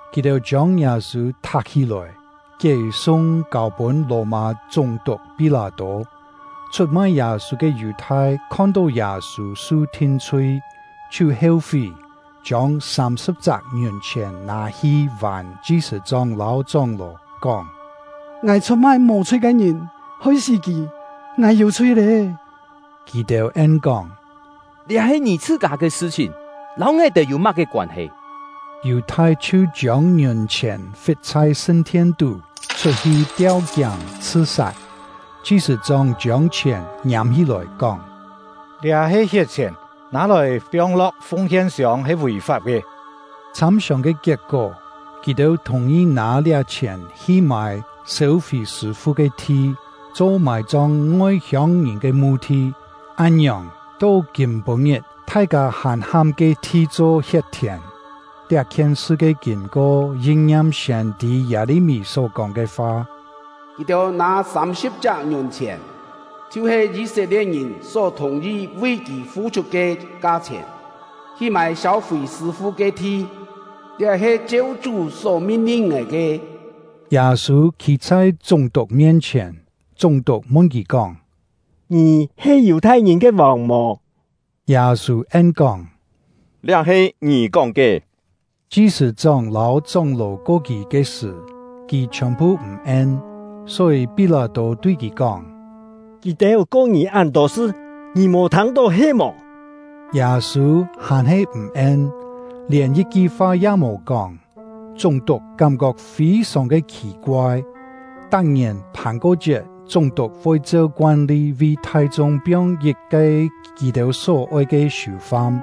Kì-têu chiông Yâ-sû thak-hí-lòi, kié-sung, kâu-pûn Lò-mâ chúng-tuk Pí-lâ-tô. Chhut-mai Yâ-sû ke Yù-thai khon-tó Yâ-sû su thin-chhui, chhiu heu-fí, chiông sâm-sṳ̍p-chak ngiùn-chhièn nâ-hi vàn chi-sṳ̂-chóng lâu chóng-ló, kóng: “Ngài chhut-mai mò-chhui ke ngìn, hoi kì sí; ngài yû chhui lé!” Kì-têu en kóng: “Liá he ngì chhṳ-kâ ke sṳ-chhìn, lâu ngài-têu yû má-ke koân-he?” Yù-thai chhiu chiông ngiùn-chhièn fit chhai sṳn-thien-tú, chhut-hi tiau-kiáng chhṳ-sat. Chi-sṳ̂-chóng chiông chhièn ngiâm-hí-lòi, kóng: “Liá he hiet-chhièn, nâ-lòi piong-lo̍k fung-hien-siông he vì-fap ke.” Chhâm-siòng ke kiet-kó, kì-têu thùng-yi nâ liá chhièn hi mâi sêu-fì sṳ̂-fu ke thi, cho mài-chong ngoi-hiông-ngìn ke mu-thi. Án-ngiòng, to kîm-pû-ngit thai-kâ hàn ham ke-thi cho “Hiet-thièn”. Liá-khien sṳ ke kîn-ko, yin-ngiam siên-tî Yâ-li-mí só-kóng ke fa: “Kì-têu nâ sâm-sṳ̍p-chak ngiùn-chhièn, chhiu-he Yî-set-lie̍t-ngìn só thùng-yi vi kì fu-chhut ke ka-chhièn, hi mâi sêu-fì sṳ̂-fu ke thi; liá he cheu Chú só min-lin ngài ke.” Yâ-sû khî chhai chúng-tuk mien-chhièn, chúng-tuk mun kì kóng: “Ngì he Yù-thai-ngìn ke vòng mò?” Yâ-sû en-kóng: “Liá he ngì kóng ke.” Chi-sṳ̂-chóng lâu chóng-ló ko kì ke sṳ̀, kì chhiòn-phu m̀ en. Só-yî Pí-lâ-tô tui kì kóng: “Kì-têu ko ngì án-tô sṳ, ngì mò thâng-tó he-mò?” Yâ-sû hàn-he m̀ en, lièn yit-ki fa ya mò kóng; chúng-tuk kám-kok fî-sòng ke khì-koai. Tak-ngièn Phàn-ko-chiet, chúng-tuk voi cheu koan-li vi thai-chung piong yit-ke kì-têu só oi ke siù-fam.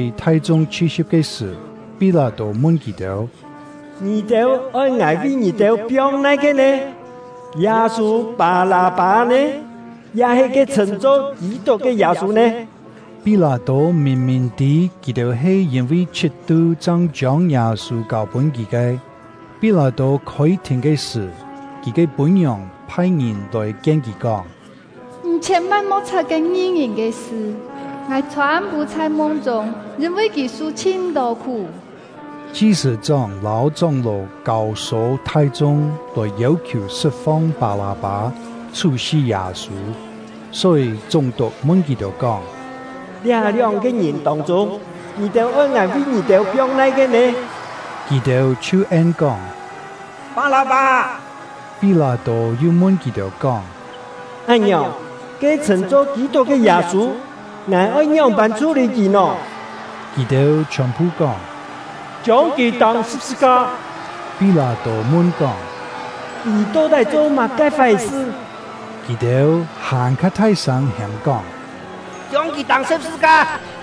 Só-yî, thai-chung chhi-si̍p ke sṳ̀, Pí-lâ-tô mun kì-têu: “Ngì-têu oi ngài vi ngì-têu piong nai-ke nè? Yâ-sû-Pâ-lâ-pâ nè? Ya-he ke chhṳ̂n-cho Kî-tuk ke Yâ-sû nè?” Pí-lâ-tô mìn-mìn tî kì-têu he yîn-vi chhit-tu chang chiông Yâ-sû kâu-pûn kì ke. Pí-lâ-tô khôi-thìn ke sṳ̀, kì ke pû-ngiòng phai-ngìn lòi-kien kì kóng: “Ngì chhiên-van mo̍k chhap ke ngi-ngìn ke sṳ; ngài chhô-am-pû chhai mung-chûng yîn-vi kì su chhin-tô khú.” Chi-sṳ̂-chóng lâu chóng-ló kâu-sô thai-chung lòi yêu-khiù sṳt-fong Pâ-lâ-pâ, chhú-sí Yâ-sû. Só-yî, chúng-tuk mun kì-têu kóng: “Liá lióng-ke ngìn tông-chûng, ngì-têu oi ngài vi ngì-têu piong nai-ke nè?” Kì-têu chhiu en-kóng: “Pâ-lâ-pâ!” Pí-lâ-tô yu mun kì-têu kóng: “Án-ngiòng, ke chhṳ̂n-cho Kî-tuk ke Yâ-sû, ngài oi ngióng-pân chhú-lî kì nò?” Kì-têu chhiòn-phu kóng: “Chiông kì tâng sṳ̍p-sṳ-ka!” Pí-lâ-tô mun kóng: “Kì to-tái cho má-ke fái-sṳ?” Kì-têu hàn-kha thai-sâng hêm-kóng: “Chiông kì tâng sṳ̍p-sṳ-ka!”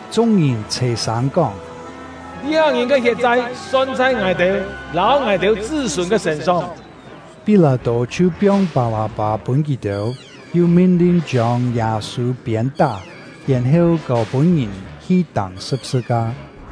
Chung-ngìn chhè-sâng kóng: “Liá ngìn ke hiet-chai, son chhai ngài-têu lâu ngài-têu chṳ́-sûn ke sṳ̂n-song!” Pí-lâ-tô chhiu piong Pâ-lâ-pâ pûn kì-têu, yu min-lin chiông Yâ-sû piên-tá, yèn-heu kâu-pûn ngìn hi tâng sṳ̍p-sṳ-ka.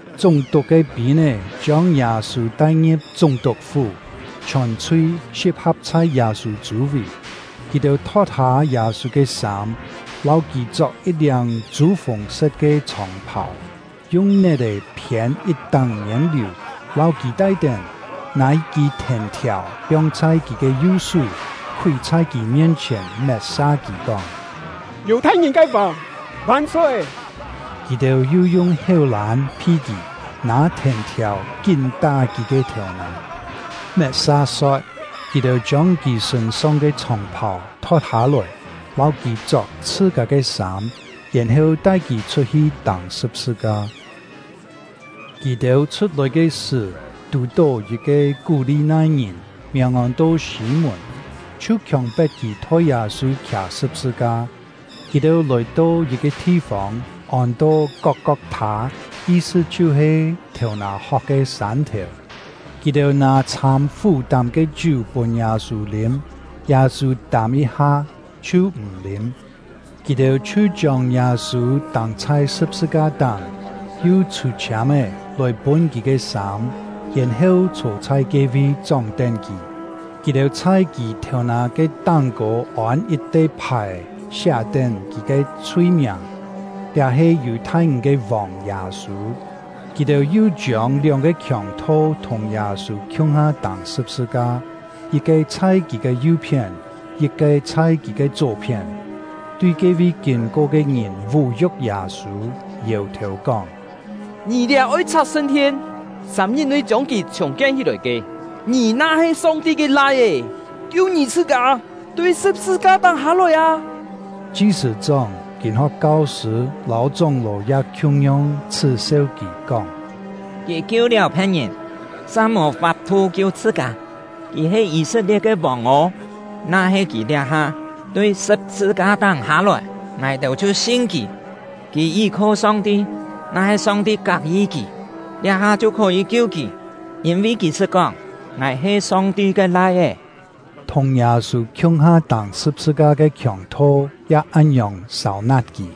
Chúng-tuk ke pîn-é chiông Yâ-sû tai-ngi̍p chúng-tuk-fú; chhiòn-chhui si̍p-ha̍p chhai Yâ-sû chû-vì. Kì-têu thot-hâ Yâ-sû ke sâm, lâu kì chok yit-liâng chû-fùng-set ke chhòng-phàu, yung net-è phiên yit-táng miên-liù, lâu kì tai-tén, nâ yit-kî thèn-thiàu piong chhai kì ke yu-sú, khúi chhai kì mien-chhièn met-sa kì, kóng: “Yù-thai-ngìn ke vòng van-soi!” Kì-têu yu yung héu-lân phi kì, nâ thèn-thiàu kín tá kì ke thèu-nà. Met-sa so̍t, kì-têu chiông kì sṳ̂n-song ke chhòng-phàu thot-hâ-lòi, lâu kì chok chhṳ-kâ ke sâm, yèn-heu tai kì chhut-hi tâng sṳ̍p-sṳ-ka. Kì-têu chhut-lòi ke sṳ̀, tù-tó yit-ke Kú-li-nai-ngìn, miàng ôn-to Sî-mùn, chhiu khiòng-pet kì thoi Yâ-sû khià sṳ̍p-sṳ-ka. Kì-têu lòi-to yit-ke thi-fông, ôn-to Kok-kok-thâ, yi-sṳ chhiu-he “Thèu-nà-hok ke Sân-thèu”. Kì-têu nâ chhâm fú-tám ke chiú pûn Yâ-sû lîm; Yâ-sû tâm yit-ha, chhiu m̀ lîm. Kì-têu chhiu chiông Yâ-sû tâng chhai sṳ̍p-sṳ-ka-táng, yu chhû-chhiâm-é lòi pûn kì ke sâm, yèn-heu chhô chhai ke-vi chóng-tén kì. Kì-têu chhai kì thèu-nà ke táng-kô ôn yit-te phài-è siá-tén kì ke chhui-miàng: “Liá he Yù-thai-ngìn ke vòng Yâ-sû.” Kì-têu yu chiông lióng-ke khiòng-tho thùng Yâ-sû khiung-ha tâng sṳ̍p-sṳ-ka, yit-ke chhai kì ke yu-phién, yit-ke chhai kì ke chó-phién. Tui ke-vi kîn-ko ke ngìn vú-yu̍k Yâ-sû, yèu-thèu, kóng: “Ngì liá oi chhak sṳn-thien, sâm-ngit-nui chiông kì chhùng-kien hí-lòi ke! Ngì na-he Song-ti ke Lai-é, kiu ngì chhṳ-kâ, tui sṳ̍p-sṳ-ka-táng hâ-lòi â!” Chi-sṳ̂-chóng, kîn-ho̍k kau-sṳ̂, lâu chóng-ló ya khiung-yong chhṳ́-seu kì, kóng: “Kì kiu-liáu phe̍t-ngìn, sa mò fap-thu kiu chhṳ-kâ! Kì he Yî-set-lie̍t ke vòng ô! Na-he kì liá-ha tui sṳ̍p-sṳ-ka-táng hâ-lòi, ngài-têu chhiu sin kì! Kì yí-kho Song-ti; na-he Song-ti kak-yi kì, liá-ha chhiu khó-yî kiu kì; yîn-vi kì sṳt kóng: ‘Ngài he Song-ti ke Lai-é.’” Thùng Yâ-sû khiung-ha tâng sṳ̍p-sṳ-ka ke khiòng-tho ya án-ngiòng sâu-nat kì.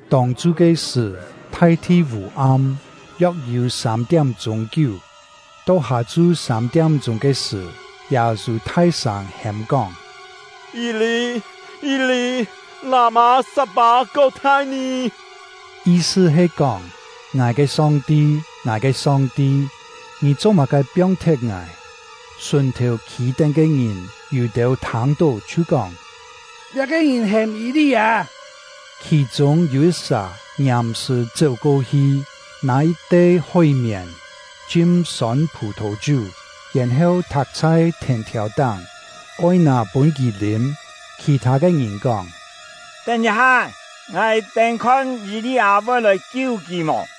Tông-chu ke sṳ̀, thai-thi vû-am, yok-yû sâm-tiám-chûng kiú. To hâ-chu sâm-tiám-chûng ke sṳ̀, Yâ-sû thai-sâng hêm-kóng: “Yî-li! Yî-li! Lâ-mâ sat-pâ-kok-thai-nì?” Yi-sṳ he kóng: “Ngài ke Song-ti, ngài ke Song-ti, Ngì cho-má-ke piong-thet ngài?” Sùn-thèu khî-tén ke ngìn, yû-têu thâng-tó chhiu kóng: “Liá-ke ngìn hêm Yî-li-â!” Khì-chûng yû yit-sà ngiàm-sṳ̀ chéu-ko-hi, nâ yit-te hói-mièn chim sôn phù-thò-chiú, yèn-heu thak chhai thèn-thiàu-táng, oi nâ pûn kì lîm. Khì-thâ ke ngìn kóng: “Tén yit-ha-é, ngài-têu khon Yî-li-â voi lòi kiu kì mò!”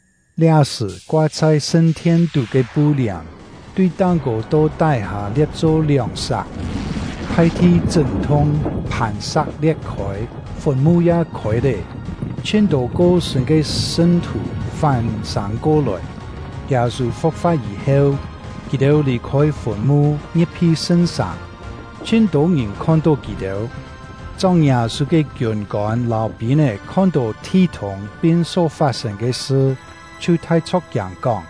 Liá-sṳ̀, koa chhai sṳn-thien-tú ke pu-liàm, tui táng-kô to tái-hâ lie̍t-cho lióng-sak. Thai-thi chṳ́n-thung, phàn-sa̍k lie̍t-khôi, fùn-mu ya khôi lé, chhin-tô ko-sṳ̂n ke sṳn-thù fán-sâng ko-lòi. Yâ-sû fu̍k-fa̍t yî-heu, kì-têu lì-khôi fùn-mu, ngi̍p-hi Sṳn-sàng; chhin tô-ngìn khon-tó kì-têu. Chóng Yâ-sû ke kiûn-kôn lâu pîn-é khon-tó thi-thûng pin só fat-sên ke sṳ, chhiu thai chho̍k-kiâng, kóng: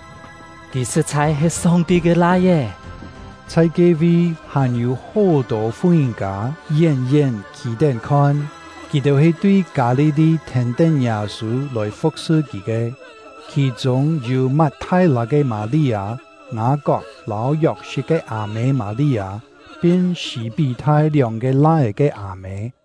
“Kì sṳ̍t-chhai he Song-ti ke Lai-é!” Chhai ke-vi, hàn-yû hó-tô fu-ngìn-kâ yén-yén khî-tén khon; kì-têu he tui Kâ-li-li thèn-tén Yâ-sû lòi fu̍k-sṳ kì ke. Khì-chûng yû Mat-thai-lâ ke Mâ-li-â, Ngâ-kok lâu Yok-sit ke â-mê Mâ-li-â, pin Sî-pí-thai lióng-ke lai-é ke â-mê.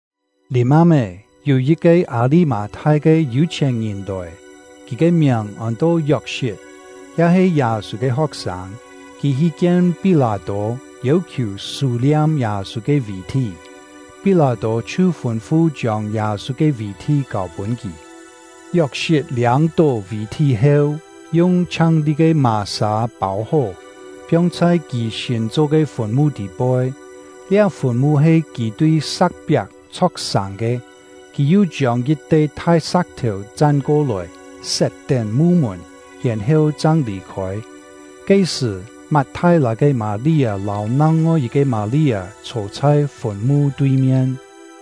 Lìm-am-é, yû yit-ke Â-li-mâ-thai ke yû-chhièn-ngìn lòi; kì ke miàng ôn-to Yok-sit, ya he Yâ-sû ke ho̍k-sâng. Kì hi kien Pí-lâ-tô, yêu-khiù sû-liam Yâ-sû ke vì-thí; Pí-lâ-tô chhiu fûn-fu chiông Yâ-sû ke vì-thí kâu-pûn kì. Yok-sit liâng-tó vì-thí heu, yung chhiang-li ke mà-sâ pâu-hó, piong chhai kì sîn cho ke fùn-mu tî-poi; liá fùn-mu he kì tui sa̍k-piak chho̍k-sàng ke. Kì yu chiông yit-te thai sa̍k-thèu chan-ko-lòi, set-tén mu-mùn, yèn-heu chang lì-khôi. Ke-sṳ̀, Mat-thai-lâ ke Mâ-li-â lâu nang-ngoi yit-ke Mâ-li-â chhô chhai fùn-mu tui-mien.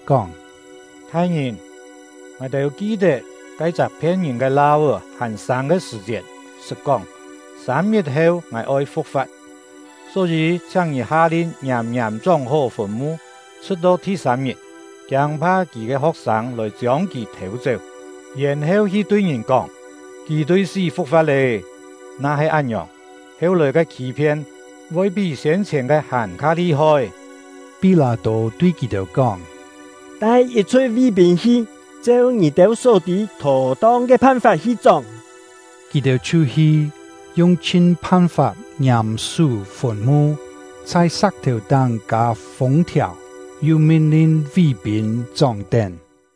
kóng: “Thai-ngìn, ngài-têu ki-tet ke-chak phien-ngìn ke lau-é hàn sâng ke sṳ̀-chiet sṳt kóng: ‘Sâm-ngit-heu ngài oi fu̍k-fa̍t.’ Só-yî, chhiáng ngì ha-lin ngiàm-ngiàm chóng-hó fùn-mu, chhṳ̍t-to thi-sâm-ngit, kiâng-pha kì ke ho̍k-sâng lòi chiông kì thêu-chéu, yèn-heu hi tui ngìn kóng: ‘Kì tui sí fu̍k-fa̍t lé.’ Na-he án-ngiòng, heu-lòi ke khî-phien voi pí siên-chhièn ke hàn-kha li-hoi.” Pí-lâ-tô tui kì-têu kóng: “Tai yit-chhui ví-pîn hi, cheu ngì-têu só tî thó-tong ke phan-fap hi chóng!” Kì-têu chhiu hi, yung-chhin phan-fap ngiàm sú fùn-mu, chhai sa̍k-thèu-táng kâ fûng-thiàu, yu min-lin ví-pîn chóng-tén.